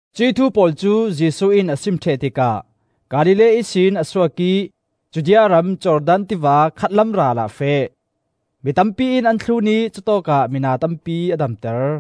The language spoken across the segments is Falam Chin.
Cuih thu pawl cu Jesuh in a sim ṭheh tikah Galilee ihsin a suak ih Judea ram, Jordan tiva khatlam ralah a feh. Mi tampi in an thlun ih cutawkah mina tampi a damter.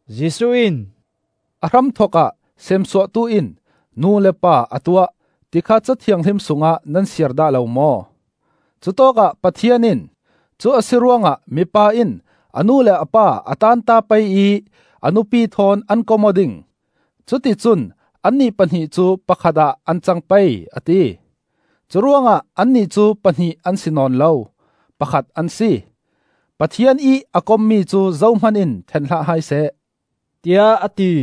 Jesuh in, “A hramthokah Seemsuahtu in nu le pa a tuah, ti kha Ca Thianghlim sungah nan siar dah lo maw? Cutawkah Pathian in ‘Cu a si ruangah mipa in a nu le a pa a taanta pei ih a nupi thawn an kom aw ding; cuti cun annih pahnih cu pakhat ah an cang pei,’ a ti. Curuangah annih cu pahnih an si nawn lo, pakhat an si. Pathian ih a kommi cu zohman in ṭhen hlah hai seh,” tiah a ti.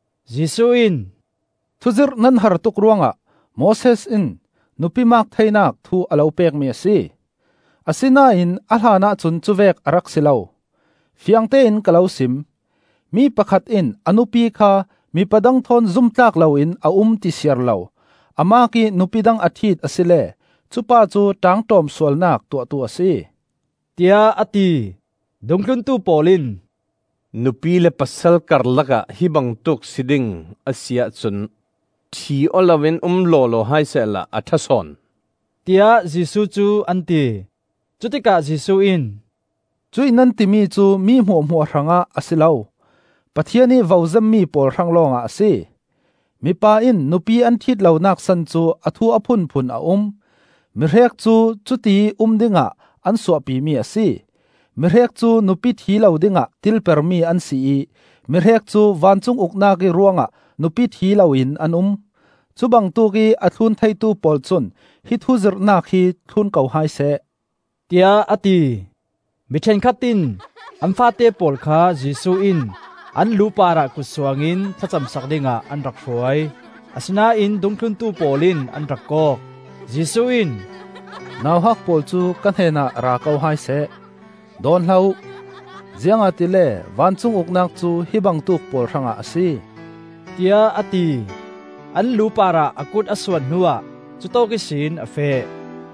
Jesuh in, “Thuzirh nan har tuk ruangah Moses in nupi maak theinak thu a lo pekmi a si. Asinain a hlanah cun cuvek a rak si lo. Fiangtein ka lo sim: mi pakhat in a nupi kha mipa dang thawn zum tlak loin a um ti siar lo, a maak ih nupi dang a ṭhit asile cupa cu ṭaangṭawm sualnak tuahtu a si,” tiah a ti. Dungthluntu pawl in, “Nupi le pasal karlakah hi bangtuk si ding a si ahcun ṭhi aw loin um lawlaw hai sehla a ṭha sawn,” tiah Jesuh cu an ti. Cutikah Jesuh in, “Cuih nan timi cu mi hmuahhmuah hrangah a si lo; Pathian ih vo zemmi pawl hrang lawngah a si. Mipa in nupi an ṭhit lonak san cu a thu a phunphun a um; mi hrek cu cutiih um dingah an suahpimi a si; mi hrek cu nupi ṭhi lo dingah tilpermi an si ih mi hrek cu vancung Uknak ih ruangah nupi ṭhi loin an um. Cubangtuk ih a thlun theitu pawl cun hi thuzirhnak hi thlun ko hai seh,” tiah a ti. Mi ṭhenkhat in an faate pawl kha Jesuh in an lu parah kut suangin thla camsak dingah an rak hruai; asinain dungthluntu pawl in an rak kawk. Jesuh in, “Nauhak pawl cu ka hnenah ra ko hai seh, dawn hlah uh; ziangahtile vancung Uknak cu hi bangtuk pawl hrangah a si,” tiah a ti. An lu parah a kut a suan hnuah cutawk ihsin a feh.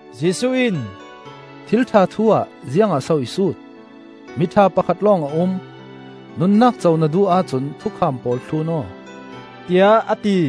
Jesuh in, “Thil ṭha thu ah ziangah so i sut? Miṭha Pakhat lawng a um. Nunnak co na duh ahcun thukham pawl thlun aw,” tiah a ti.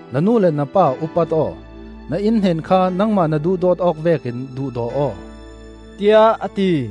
na nu le na pa upat aw; na inn hnen kha nangmah na duhdawt awk vekin duhdaw aw,” tiah a ti.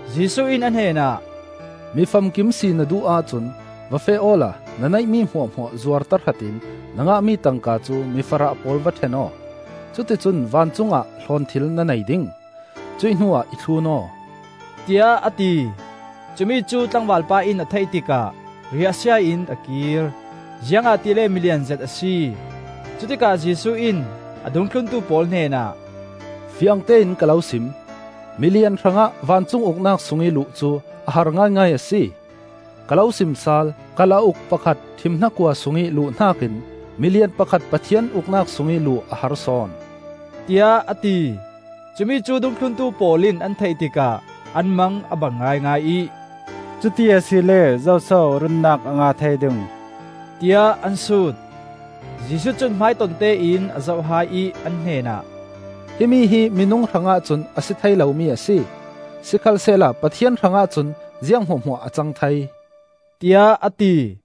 Jesuh in a hnenah, “Mi famkim si na duh ahcun va feh awla na neihmi hmuahhmuah zuar tahratin na ngahmi tangka cu mi farah pawl va ṭhen aw; cuticun vancung ah hlawnthil na nei ding. Cuih hnuah i thlun aw,” tiah a ti. Cumi cu tlangvalpa in a theih tikah riah sia in a kir, ziangahtile milian zet a si. Cutikah Jesuh in a dungthluntu pawl hnenah, “Fiangtein ka lo sim: milian hrangah vancung Uknak sungih luh cu a har ngaingai a si. Ka lo sim sal: Kalauk pakhat ṭhim hnakua sungih luh hnakin milian pakhat Pathian Uknak sungih luh a har sawn,” tiah a ti. Cumi cu dungthluntu pawl in an theih tikah an mang a bang ngaingai ih, “Cuti asile zoso runnak a ngah thei ding,” tiah an sut. Jesuh cun hmaitontein a zoh hai ih an hnenah, “Himi hi minung hrangah cun a si thei lomi a si, sikhalsehla Pathian hrangah cun ziang hmuahhmuah a cang thei,” tiah a ti.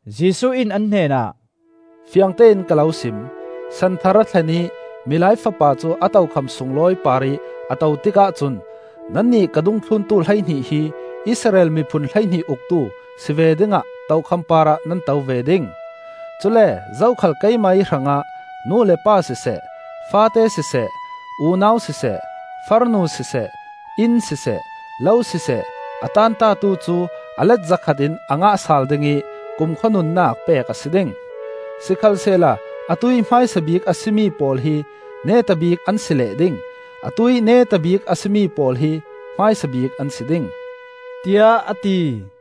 Jesuh in an hnenah, “Fiangtein ka lo sim: San Thar a thlen ih Milai Fapa cu a tokham sunglawi parih a to tikah cun nannih ka dungthluntu hleihnih hi Israel miphun hleihnih uktu si ve dingah tokham parah nan to ve ding. Cule zokhal keimah ih hrangah nu le pa siseh, faate siseh, unau siseh, farnu siseh, inn siseh, lo siseh, a taantatu cu a let zakhat in a ngah sal ding ih kumkhua nunnak pek a si ding. Sikhalsehla atuih hmaisa bik a si mi pawl hi neta bik an si leh ding; atuih neta bik a si mi pawl hi hmaisa bik an si ding,” tiah a ti.